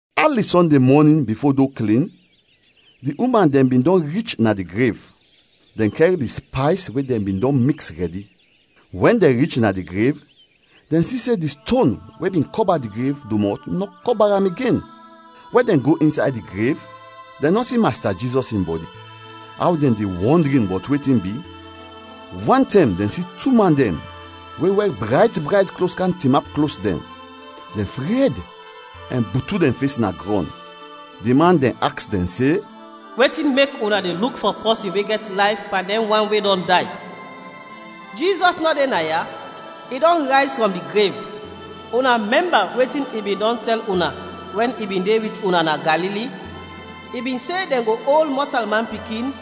Ali Sɔnde mɔnin bifo do klin, di uman dɛn bin dɔn rich na di grev. Dɛn kɛr di spays we dɛn bin dɔn miks rɛdi. Wɛn dɛn rich na di grev, dɛn si se di ston we bin kɔba di grev domɔt nɔ kɔba am igen. Wɛn dɛn go insay di grev, dɛn nɔ si Masta Jizɔs in bɔdi. Aw dɛn de wɔndrin bɔt wetin bi, wantɛm dɛn si tu man dɛn we wɛr brayt brayt klos kam tinap klos dɛn. Dɛn fred ɛn butu dɛn fes na grɔn. Di man dɛn aks dɛn se, “Wetin mek una de luk fɔ pɔsin we gɛt layf pan dɛn wan we dɔn day? Jizɔs nɔ de naya, i dɔn rayz frɔm di grev. Una mɛmba wetin i bin dɔn tɛl una wɛn i bin de wit una na Galili? I bin se dɛn go ol Mɔtalman Pikin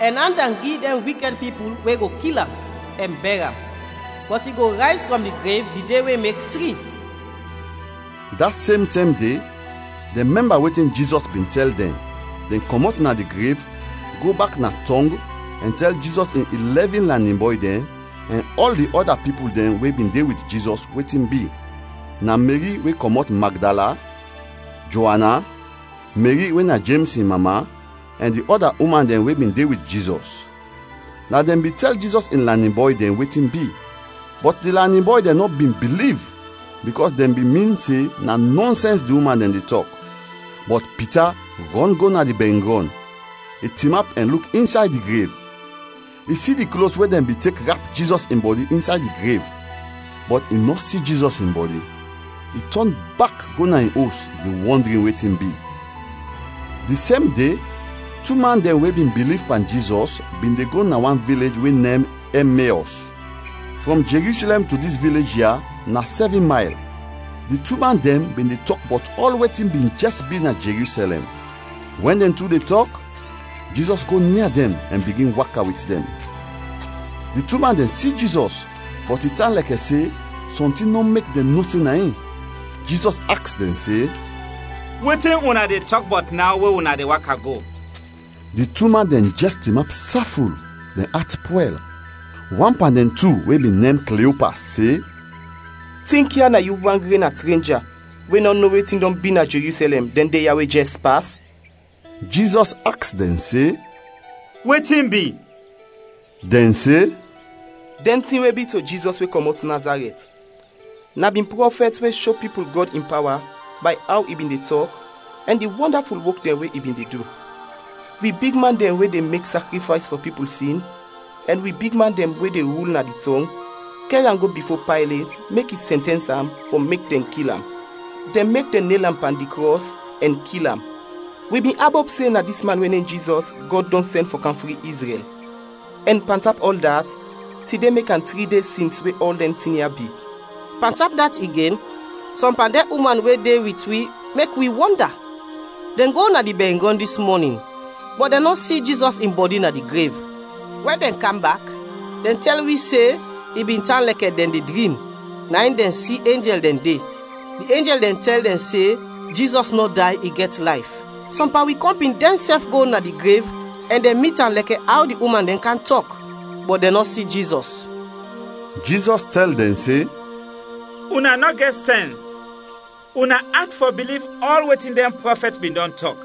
ɛn and am gi dɛn wikɛd pipul we go kil am, ɛn bɛr am, bɔt i go rayz frɔm di grev di de we mek tri.” Da sem tɛm de, dɛn mɛmba wetin Jizɔs bin tɛl dɛn, dɛn kɔmɔt na di grev, go bak na tɔng ɛn tɛl Jizɔs in ilɛvin lanin bɔy dɛn ɛn ɔl di ɔda pipul dɛn we bin de wit Jizɔs, wetin bi. Na Meri we kɔmɔt Magdala, Joana, Meri we na Jems in mama, ɛn di ɔda uman dɛn we bin de wit Jizɔs; na dɛn bin tɛl Jizɔs in lanin bɔy dɛn wetin bi. Bɔt di lanin bɔy dɛn nɔ bin biliv bikɔs dɛn bin min se na nɔnsɛns di uman dɛn de tɔk. [ Bɔt Pita rɔn go na di bɛringrɔn, i tinap ɛn luk insay di grev. I si di klos we dɛn bin tek rap Jizɔs in bɔdi insay di grev, bɔt i nɔ si Jizɔs in bɔdi. I tɔn bak go na in os de wɔndrin wetin bi.] Di sem de, tu man dɛn we bin biliv pan Jizɔs bin de go na wan vilej we nem Ɛmeɔs. Frɔm Jerusɛlɛm to dis vilej ya na sɛvin mayl. Di tu man dɛn bin de tɔk bɔt ɔl wetin bin jɛs bi na Jerusɛlɛm. Wɛn dɛn tu de tɔk, Jizɔs go nia dɛn ɛn bigin waka wit dɛn. Di tu man dɛn si Jizɔs, bɔt i tan lɛkɛ se sɔntin nɔ mek dɛn no se na in. Jizɔs aks dɛn se, “Wetin una de tɔk bɔt naw we una de waka go?” Di tu man dɛn jɛs tinap saful, dɛn at pwɛl. Wan pan dɛn tu we bin nem Kliopas se, “Tinkya, na yu wan gren na trenja we nɔ no wetin dɔn bi na Jerusɛlɛm, dɛn de ya we jɛs pas?” Jizɔs aks dɛn se, “Wetin bi?” Dɛn se, “Dɛn tin we bi to Jizɔs we kɔmɔt Nazarɛt. Na bin prɔfɛt we sho pipul Gɔd in pawa bay aw i bin de tɔk ɛn di wɔndaful wok dɛn we i bin de du. Wi bigman dɛn we de mek sakrifays fɔ pipul sin ɛn wi bigman dɛn we de rul na di tɔng kɛr am go bifo Paylet mek i sɛntɛns am fɔ mek dɛn kil am; dɛn mek dɛn nel am pan di krɔs ɛn kil am. Wi bin abop se na dis man we nem Jizɔs, Gɔd dɔn sɛn fɔ kam fri Izrɛl. Ɛn pan tap ɔl dat, tide mek tri de sins we ɔl dɛn tin ya bi. Pantap dat igen, sɔm pan dɛn uman we de wit wi mek wi wɔnda. Dɛn go na di bɛringrɔn dis mɔnin, bɔt dɛn nɔ si Jizɔs in bɔdi na di grev. Wɛn dɛn kam bak, dɛn tɛl wi se i bin tan lɛkɛ dɛn de drim, na in dɛn si enjɛl dɛn de, di enjɛl dɛn tɛl dɛn se Jizɔs nɔ day, i gɛt layf. Sɔm pan wi kɔmpin dɛnsɛf go na di grev ɛn dɛn mit am lɛkɛ aw di uman dɛn kam tɔk, bɔt dɛn nɔ si Jizɔs.” Jizɔs tɛl dɛn se, “Una nɔ gɛt sɛns, una at fɔ biliv ɔl wetin dɛn prɔfɛt bin dɔn tɔk!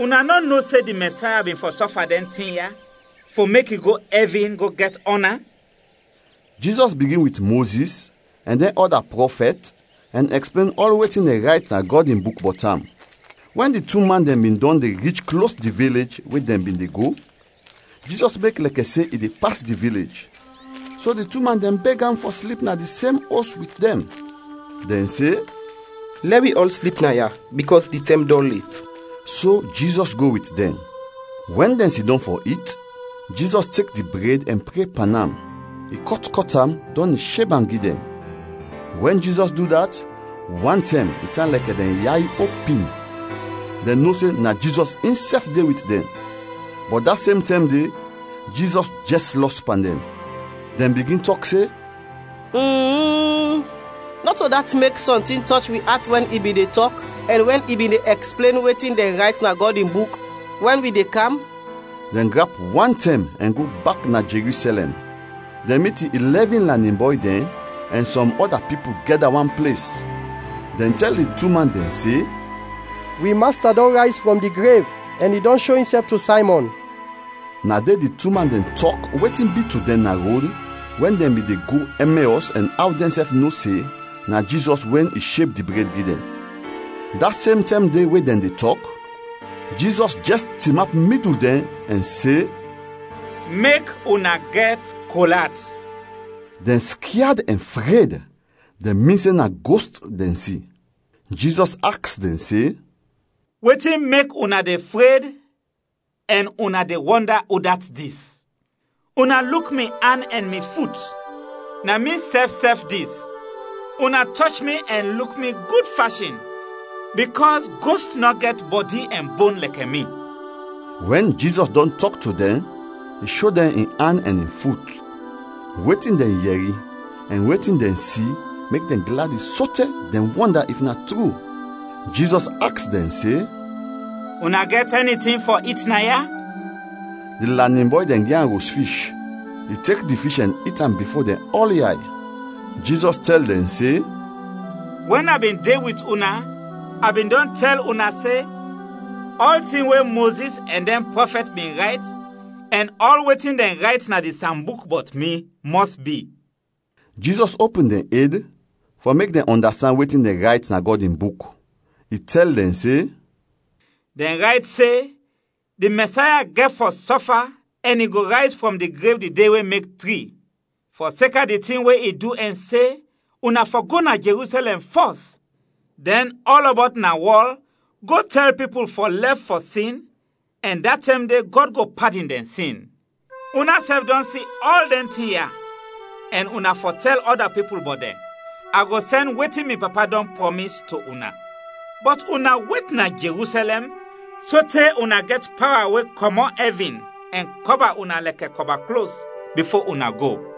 Una nɔ no se di Mɛsaya bin fɔ sɔfa dɛn tin ya fɔ mek i go ɛvin go gɛt ɔna?” Jizɔs bigin wit Mozis ɛn dɛn ɔda prɔfɛt ɛn ɛksplen ɔl wetin dɛn rayt na Gɔd in Buk bɔt am. Wɛn di tu man dɛn bin dɔn de rich klos di vilej we dɛn bin de go, Jizɔs mek lɛkɛ se in de pas di vilej, so di tu man dɛn beg am fɔ slip na di sem os wit dɛn. Dɛn se, “Lɛ wi ɔl slip naya bikɔs di tɛm dɔn let.” So Jizɔs go wit dɛn. Wɛn dɛn sidɔm fɔ it, Jizɔs tek di bred ɛn pre pan am, i kɔt kɔt am, dɔn i sheb am gi dɛn. Wɛn Jizɔs du dat, wantɛm i tan lɛkɛ dɛn yay opin, dɛn no se na Jizɔs insɛf de wit dɛn, bɔt da sem tɛm de, Jizɔs jɛs lɔs pan dɛn. Dɛn bigin tɔk se, “Nɔto dat mek sɔntin tɔch wi at wɛn i bin de tɔk ɛn wɛn i bin de ɛksplen wetin dɛn rayt na Gɔd in Buk, wɛn wi de kam?” Dɛn grap wantɛm ɛn go bak na Jerusɛlɛm, dɛn mit di ilɛvin lanin bɔy dɛn ɛn sɔm ɔda pipul gɛda wan ples. Dɛn tɛl di tu man dɛn se, “Wi Masta dɔn rayz frɔm di grev ɛn i dɔn sho insɛf to Saymɔn!” Na de di tu man dɛn tɔk wetin bi to dɛn na rod wɛn dɛn bin de go Ɛmeɔs ɛn aw dɛnsɛf no se na Jizɔs wɛn i sheb di bred gi dɛn. Da sem tɛm de we dɛn de tɔk, Jizɔs jɛs tinap midul dɛn ɛn se, “Mek una gɛt kol at!” Dɛn skyad ɛn fred, dɛn min se na gost dɛn si. Jizɔs aks dɛn se, “Wetin mek una de fred ɛn una de wɔnda udat dis? Una luk mi an ɛn mi fut, na mi sɛf sɛf dis. Una tɔch mi ɛn luk mi gud fashin bikɔs gost nɔ gɛt bɔdi ɛn bon lɛkɛ mi.” Wɛn Jizɔs dɔn tɔk to dɛn, i sho dɛn in an ɛn in fut. Wetin dɛn yɛri ɛn wetin dɛn si mek dɛn gladi sote dɛn wɔnda if na tru. Jizɔs aks dɛn se, “Una gɛt ɛni tin fɔ it naya?” Di lanin bɔy dɛn gi am ros fish. I tek di fish ɛn it am bifo dɛn ɔl yay. Jizɔs tɛl dɛn se, “Wɛn a bin de wit una, a bin dɔn tɛl una se ɔltin we Mozis ɛn dɛn prɔfɛt bin rayt ɛn ɔl wetin dɛn rayt na di Sambuk bɔt mi, mɔs bi.” Jizɔs opin dɛn ed fɔ mek dɛn ɔndastand wetin dɛn rayt na Gɔd in Buk. I tɛl dɛn se, “Dɛn rayt se di Mɛsaya gɛt fɔ sɔfa ɛn i go rayz frɔm di grev di de we mek tri. Fɔseka di tin we i du ɛn se, una fɔ go na Jerusɛlɛm fɔs, dɛn ɔlɔbɔt na wɔl, go tɛl pipul fɔ lɛf fɔ sin ɛn da tɛm de Gɔd go padin dɛn sin. Unasɛf dɔn si ɔl dɛn tin ya ɛn una fɔ tɛl ɔda pipul bɔt dɛn. A go sɛn wetin mi Papa dɔn prɔmis to una. Bɔt una wet na Jerusɛlɛm sote una gɛt pawa we kɔmɔt ɛvin ɛn kɔba una lɛkɛ kɔba klos, bifo una go.”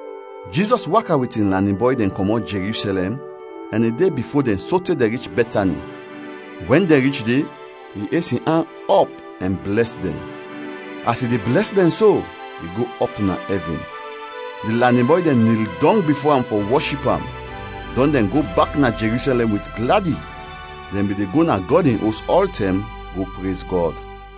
Jizɔs waka wit in lanin bɔy dɛn kɔmɔt Jerusɛlɛm ɛn i de bifo dɛn sote dɛn rich Bɛtani. Wɛn dɛn rich de, i es in an ɔp ɛn blɛs dɛn. As i de blɛs dɛn so, i go ɔp na ɛvin. Di lanin bɔy dɛn nil dɔng bifo am fɔ wɔship am, dɔn dɛn go bak na Jerusɛlɛm wit gladi. Dɛn bin de go na Gɔd in Os ɔltɛm go prez Gɔd.